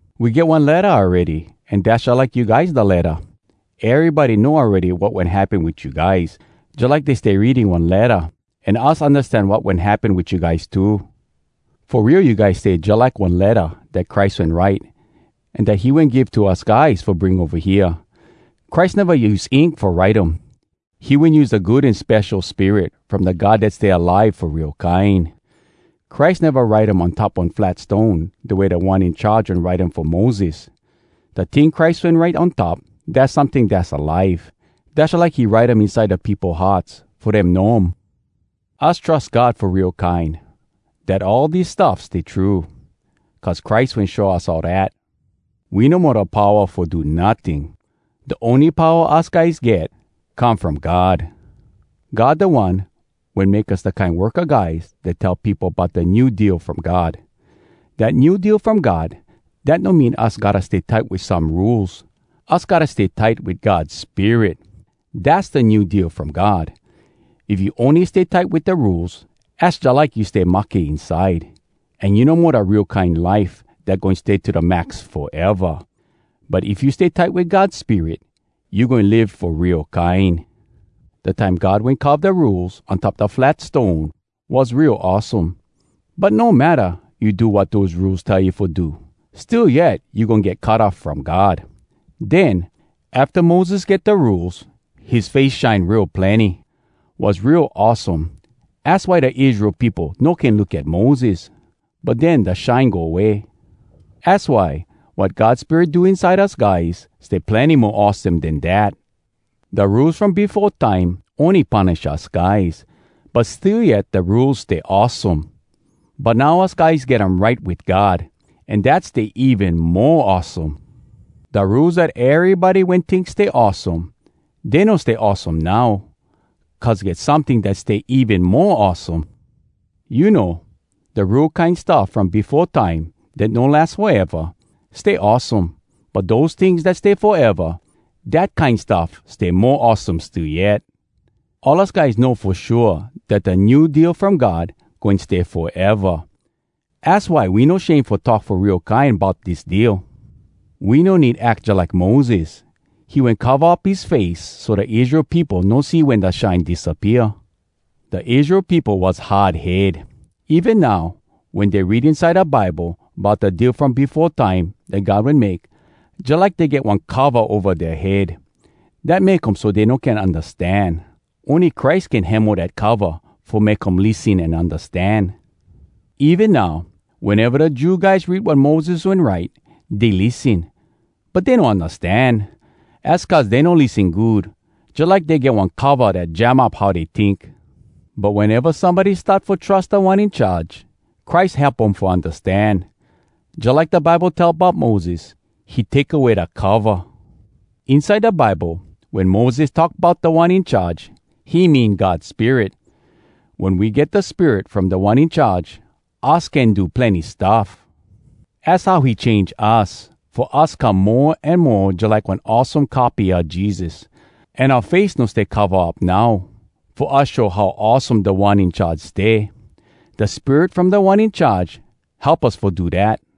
We get one letta awready, an dass jalike you guys da letta! Erybody know awready wat wen happen wit you guys, jalike dey stay reading one letta. An us undastan wat wen happen wit you guys too. Fo real you guys stay jalike one letta dat Christ wen write, an dat he wen give to us guys fo bring ova hea. Christ neva use ink fo write um. He wen use da Good An Spesho Spirit from da God dat stay alive fo real kine. Christ neva write um on top one flat stone da way Da One In Charge wen write um fo Moses—da ting Christ wen write on top, dass someting dass alive. Dass jalike he write um inside da peopo hearts fo dem know um. Us trus God fo real kine dat all dis stuff stay true, cuz Christ wen show us all dat. We no mo da powa fo do notting. Da ony powa us guys get, come from God. God da One wen make us da kine worka guys dat tell peopo bout da New Deal From God. Dat New Deal From God, dat no mean us gotta stay tight wit some rules! Us gotta stay tight wit God Spirit! Dass da New Deal From God. If you ony stay tight wit da Rules, az jalike you stay mahke inside, an you no mo da real kine life dat goin stay to da max foeva! But if you stay tight wit God Spirit, you goin live fo real kine! Da time God wen carve da Rules on top da flat stone, was real awesome. (But no matta you do wat dose Rules tell you fo do, still yet you goin get cut off from God.) Den, afta Moses get da Rules, his face shine real plenny. Was real awesome, az why da Israel peopo no can look at Moses. But den da shine go way. Az why wat God Spirit do inside us guys stay plenny mo awesome den dat! Da Rules from befo time ony punish us guys, but still yet da Rules stay awesome. But now us guys get um right wit God, an dat stay even mo awesome. Da Rules dat erybody wen tink stay awesome, dey no stay awesome now, cuz get someting dat stay even mo awesome. You know, da Rule kine stuff from befo time dat no las foeva, stay awesome. But dose tings dat stay foeva, dat kine stuff stay mo awesome still yet. All us guys know fo shua dat da New Deal from God goin stay foeva. Az why we no shame fo talk fo real kine bout dis Deal. We no need ack jalike Moses. He wen cova up his face so da Israel peopo no see wen da shine disappea. Da Israel peopo was hard head. Even now wen dey read inside da Bible bout da Deal from befo time dat God wen make, jalike dey get one cova ova dea head. Dat make um so dey no can undastan. Ony Christ can hemo dat cova fo make um lissen an undastan! Even now, weneva da Jew guys read wat Moses wen write, dey lissen. But dey no undastan! Az cuz dey no lissen good, jalike dey get one cova dat jam up how dey tink. But weneva somebody start fo trus Da One In Charge, Christ help um fo undastan. Jalike da Bible tell bout Moses, “He take away da cova.” Inside da Bible, wen Moses talk bout “Da One In Charge,” he mean God Spirit. Wen we get da Spirit from Da One In Charge, us can do plenny stuff. Az how he change us fo us come mo an mo jalike one awesome copy a Jesus. An oua face no stay cova up now, fo us show how awesome Da One In Charge stay. Da Spirit from Da One In Charge help us fo do dat.